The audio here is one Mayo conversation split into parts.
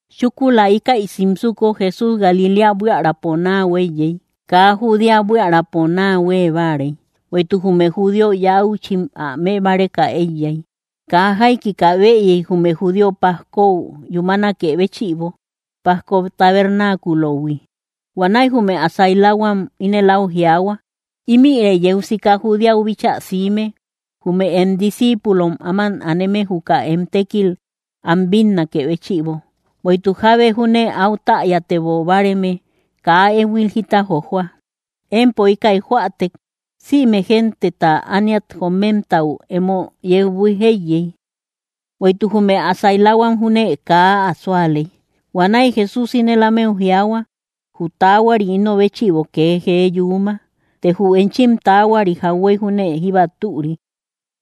Chúkula íkäi simsuko, Jesús Galiléa buiärapo naa huéiyey; kaa Judea buiärapo naa huée báarey, bueïtuk jume judío yauchim ä mëbáreka éiyay. Kaa jaikika bëyey jume judíom pajkou yúmanakë béchïbo, pajko tabernáculohui. Huanäi jume ä sailahuam ínel áu jiaahua: —Ímïre yeu sika Judeau bíchaa siime, jume em discíipulom áman aneme juka em tékil am bínnakë béchïbo. Bueïtuk jábe júne áu täyatebo báareme kaa éhuil jita jojoa. Empo íkäi joätek, sïme genteta ániat jomemtau emo yeu buíj éiyey. Bueïtuk jume ä sailahuam júne kaa ä súaley. Huanäi Jesús ínel ámeu jiaahua: —Jü taahuari ino béchïbo kee jee yuuma, të jü enchim taahuari jauhuey júne jíba türi.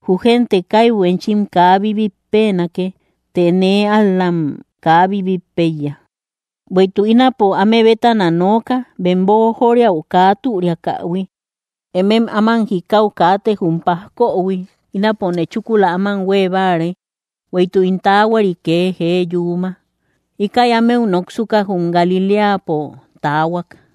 Jü génte kaibu enchim kaa bibitpenake, të nee ál‑lam kaa bibitpeiya, bueïtuk ínapo áme bétana nooka, bem boojoriau kaa türiakähui. Emem áman jikau kaate jum pajkohui; ínapone chúkula áman huée báare, bueïtuk ín taahuari kee jee yuuma. Íkäi ámeu noksuka, jum Galiléapo taahuak.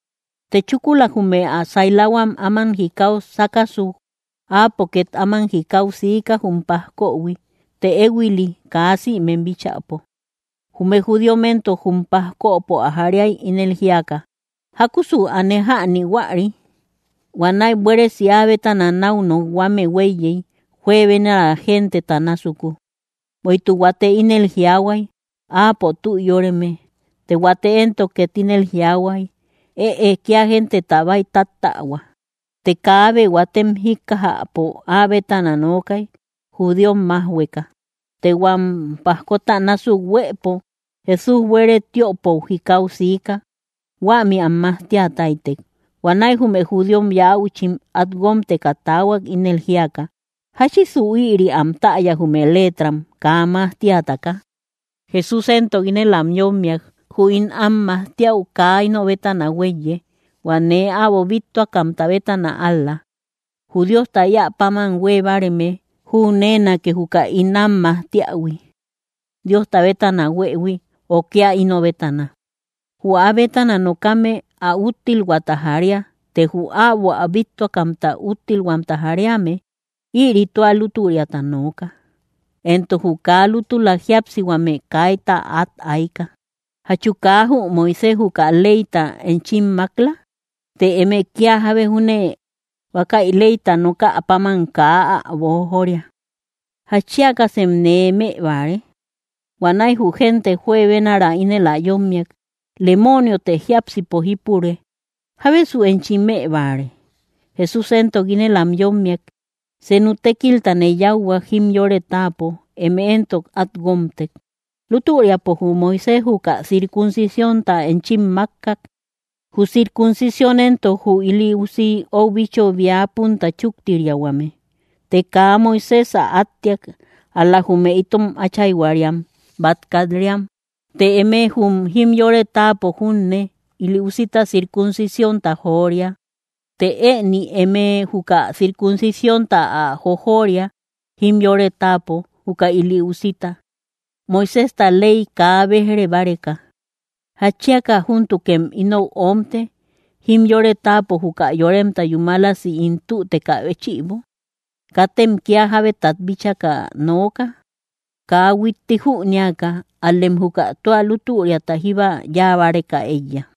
Të chúkula jume ä sailahuam áman jikau sákasuk, áapo két áman jikau siika jum pajkohui, të éhuili kaa sïmem bíchäpo. Jume judíom éntok jum pajkopo ä jariay, ínel jíaka: —¿Jákusu aane jäni huäri? Huanäi buéresi áa bétana náu nokhuame huéiyey juebenara genteta násuku. Bueïtuk huate ínel jiaahuay: “Áapo tü yóreme”; të huate entok ket ínel jiaahuay: “Ëe, kía genteta bäitáttähua.” Të kaabe huatem jíkkajäpo áa bétana nookay, judíom májhueka. Të huam pajkota násuk huëpo, Jesús buere tiöpou jikau siika huämi am majtia táytek. Huanäi jume judíom yauchim át guómteka taahuak, ínel jíaka: —¿Jáchisu ïri am täya jume letram, kaa majtiataka? Jesús éntok ínel am yómmiak: —Jü ín am majtiäu kaa ino bétana huéiye, hua nee äbo bíttuakamta bétana ál‑la. Jü Diosta éä páman huée báareme, jüneenake juka ín am majtiähui Diosta bétana huëhui ö kía ino bétana. Jü áa bétana nokame ä úttilhuaata jaria; të jü äbo ä bíttuakamta úttilhuamta jariame, ïri tua lútüriata nooka, éntok jü kaa lútula jíapsihuame kayta át ayka. ’¿Jachu kaa jü Moisés juka leyta enchim mák‑la? Të eme kia jábe júne, huákäi leyta nokä páman kaa ä boojoria. ¿Jatchiakasem nee më báare? Huanäi jü génte juebenara ínel ä yómmiak: —Lemooniotë jiápsipo jípure. ¿Jábesu enchi më báare? Jesús éntok ínel am yómmiak: —Senu tékiltane yáuhuak jimyore táapo, eme éntok át guómtek. Lútüriapo jü Moisés juka circuncisiónta enchim mákkak. Jü circuncición entok (jü ili usi ou bicho bia punta chuktiriahuame), të kaa Moisés ä átteak, ál-la jume itom áchayhuariam bát kat-riam, të eme jum jimyore táapo junne ili usita circuncisiónta joria. Të ëni, eme juka circuncisiónta ä jojoria jimyore táapo juka ili usita, Moiséjta ley kaa béj‑re báreka. ¿Jatchiaka júntukem inou omte, jimyore táapo juka yoremta yúmalasi ín tütekä béchïbo? Katem kía jábetat bíchaka nooka kaa huiti jünéaka, ál‑lem juka tua lútüriata jíba yáa báreka éiya.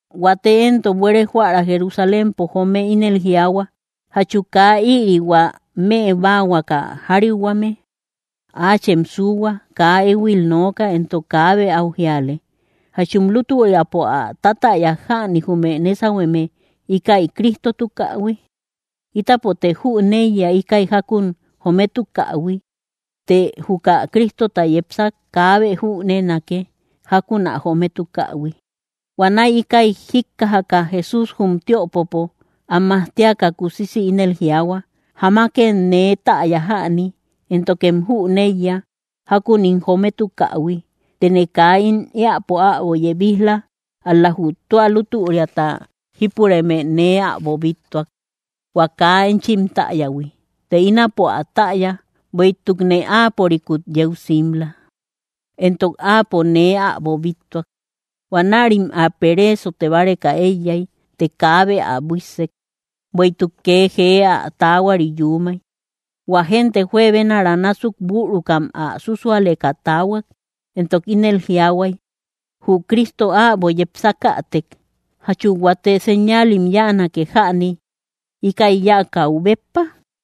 Huate éntok buere joära Jerusalémpo joome ínel jiaahua: —¿Jachu kaa ïri, hua më báahuaka jariuhuame? Áachem suuhua, kaa éhuil nooka, éntok kaabe áu jíale. ¿Jachum lútüriapo ä tatäyak jäni jume nesahueme íkäi Cristotukähui? Ítapote jüneiya íkäi jákun jometukähui; të juka Cristota yepsak, kaabe jüneenake jákun ä jometukähui. Huanäi ikäi jikkajaka, Jesús, jum tiöpopo am majtiaka kusisi ínel jiaahua: —Jamakem nee täya jäni, éntokem jüneiya jákun ín jometukähui; tëne kaa ín éäpo äbo yebij‑la; ál‑la jü tua lútüriata jípureme nee äbo bíttuak, hua kaa enchim täyähui. Të ínapo ä täya bueïtukne áapörikut yeu simla, éntok áapo nee äbo bíttuak. Huanärim ä pereesote báreka éiyay, të kaabe ä buíssek, bueïtuk kee jee ä taahuari yuumay. Huä génte juebenara násuk bürukam ä sússualeka taahuak, éntokim ínel jiaahuay: —Jü Cristo äbo yepsakätek, ¿jachu huate señaalim yáanake jäni íkäi yáakäu béppa?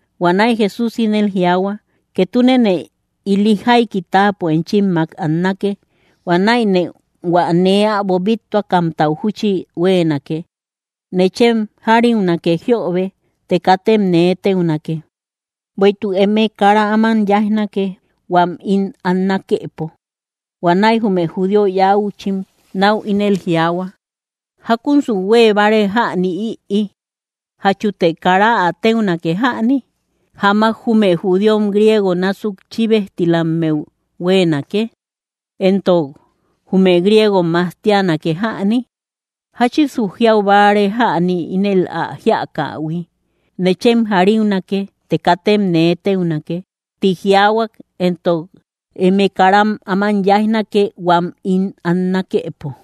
Huanäi Jesús ínel jiaahua: —Ketunene ili jaiki táapo enchimmak annake; huanäine hua nee äbo bíttuakamtau júchi huéenake. Nechem jariunake jiöbe të katem nee téunake. Bueïtuk eme kara áman yáijnake huam ín annakepo. Huanäi jume judío yäuchim náu ínel jiaahua: —¿Jákunsu huée báare jäni ïi, jachute kara ä téunake jäni? ¿Jamak jume judíom griegom násuk chíbejtilammeu huéenake? Éntok, ¿jume griegom majtianake jäni? ¿Jáchisu jiau báare jäni ínel ä jíakähui? “Nechem jariunake, të katem nee téunake, ti jiaahuak; éntok, ¡eme kara áman yáijnake, huam ín annakepo!”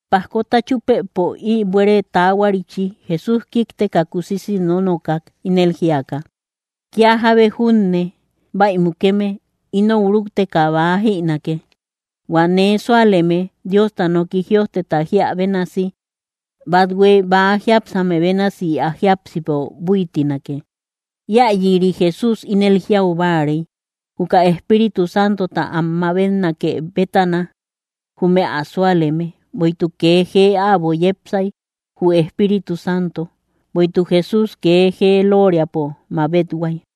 Pajkota chúpëpo ï buere taahuarichi, Jesús kíkteka kusisi nónokak, ínel jíaka: —Kía jábe junne bäi mukeme, inou rúkteka bäa jïnake. Huä nee súaleme, Diosta noki jïojteta jíä bénasi, bathue bäa jiápsame bénasi ä jiápsipo búitinake. Iayïri Jesús ínel jiau báarey juka Espíritu Santota am mabetnake bétana jume ä súaleme; bueïtuk kee jee äbo yepsay jü Espíritu Santo, bueïtuk Jesús kee jee lóoriapo mabethuay.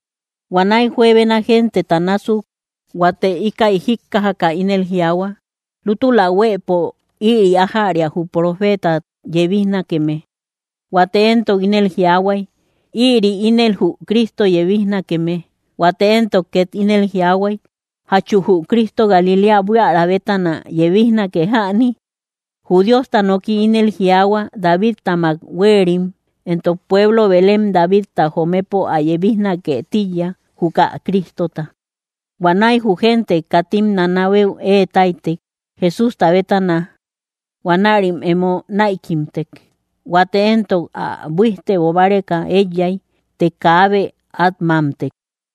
Huanäi juebena genteta násuk, huate íkäi jíkkajaka, ínel jiaahuak: —Lútula huëpo ïri ájäria jü profeeta yebijnakeme. Huate éntok ínel jiaahuay: —Ïri ínel jü Cristo yebijnakeme. Huate entok két ínel jiaahuay: —¿Jachu jü Cristo Galiléa buiära bétana yebijnake jäni? Jü Diosta noki ínel jiaahua Davidtamak huéerim, éntok pueblo Belén Davidta jomëpo ä yebijnake tíiya, juka Cristota. Huanäi jü génte katim nanabeu ée táytek, Jesústa bétana. Huanärim emo näikimtek. Huate éntok ä buíjtebo báreka éiyay; të kaabe át mámtek.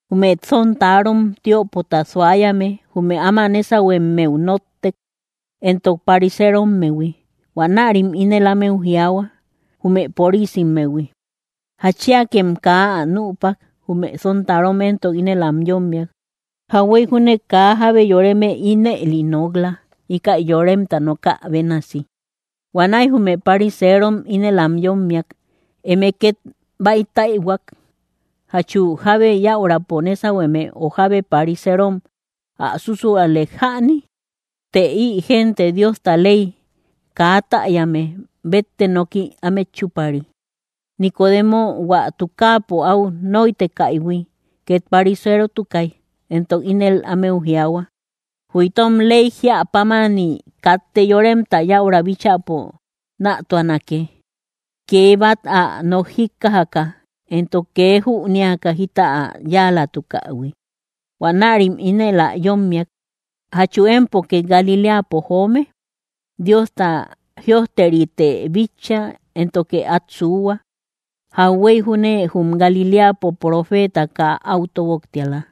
Jume sontarom tiöpota suayame jume áma nésahuemmeu nóttek, éntok pariserommehui, huanärim ínel ámeu jiaahua, jume porisimmehui: —¿Jatchiakem kaa ä nüpak? Jume sontarom entok ínel am yómmiak: —¡Jauhuey júne kaa jábe yoreme ínëli nok‑la íkäi yoremta nokä bénasi! Huanäi jume pariseerom ínel am yómmiak: —¿Eme két bäitäihuak? ¿Jachu jábe yäurapo nésahueme o jábe pariserom ä súsualek jäni? Të ï génte Diosta ley kaa täyame, bétte noki ámet chúpari. Nicodemo, hua tukaapo áu nóitekaïhui, ket pariserotukai; éntok ínel ámeu jiaahua: —Jü itom ley jia pámani katte yoremta yäura bíchäpo nätuanake kee bát ä nok jíkkajaka éntok kee jünéaka jita ä yáalatukähui. Huanärim ínel ä yómmiak: —¿Jachu empo két Galiléapo joome? Diosta jïojteritë bitcha éntoke át suuhua, jauhuey júne jum Galiléapo profeeta kaa áu tóboktiala.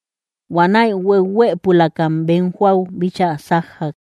Huanaäi hueuhuëpulakam bem jóau bíchaa sájjak.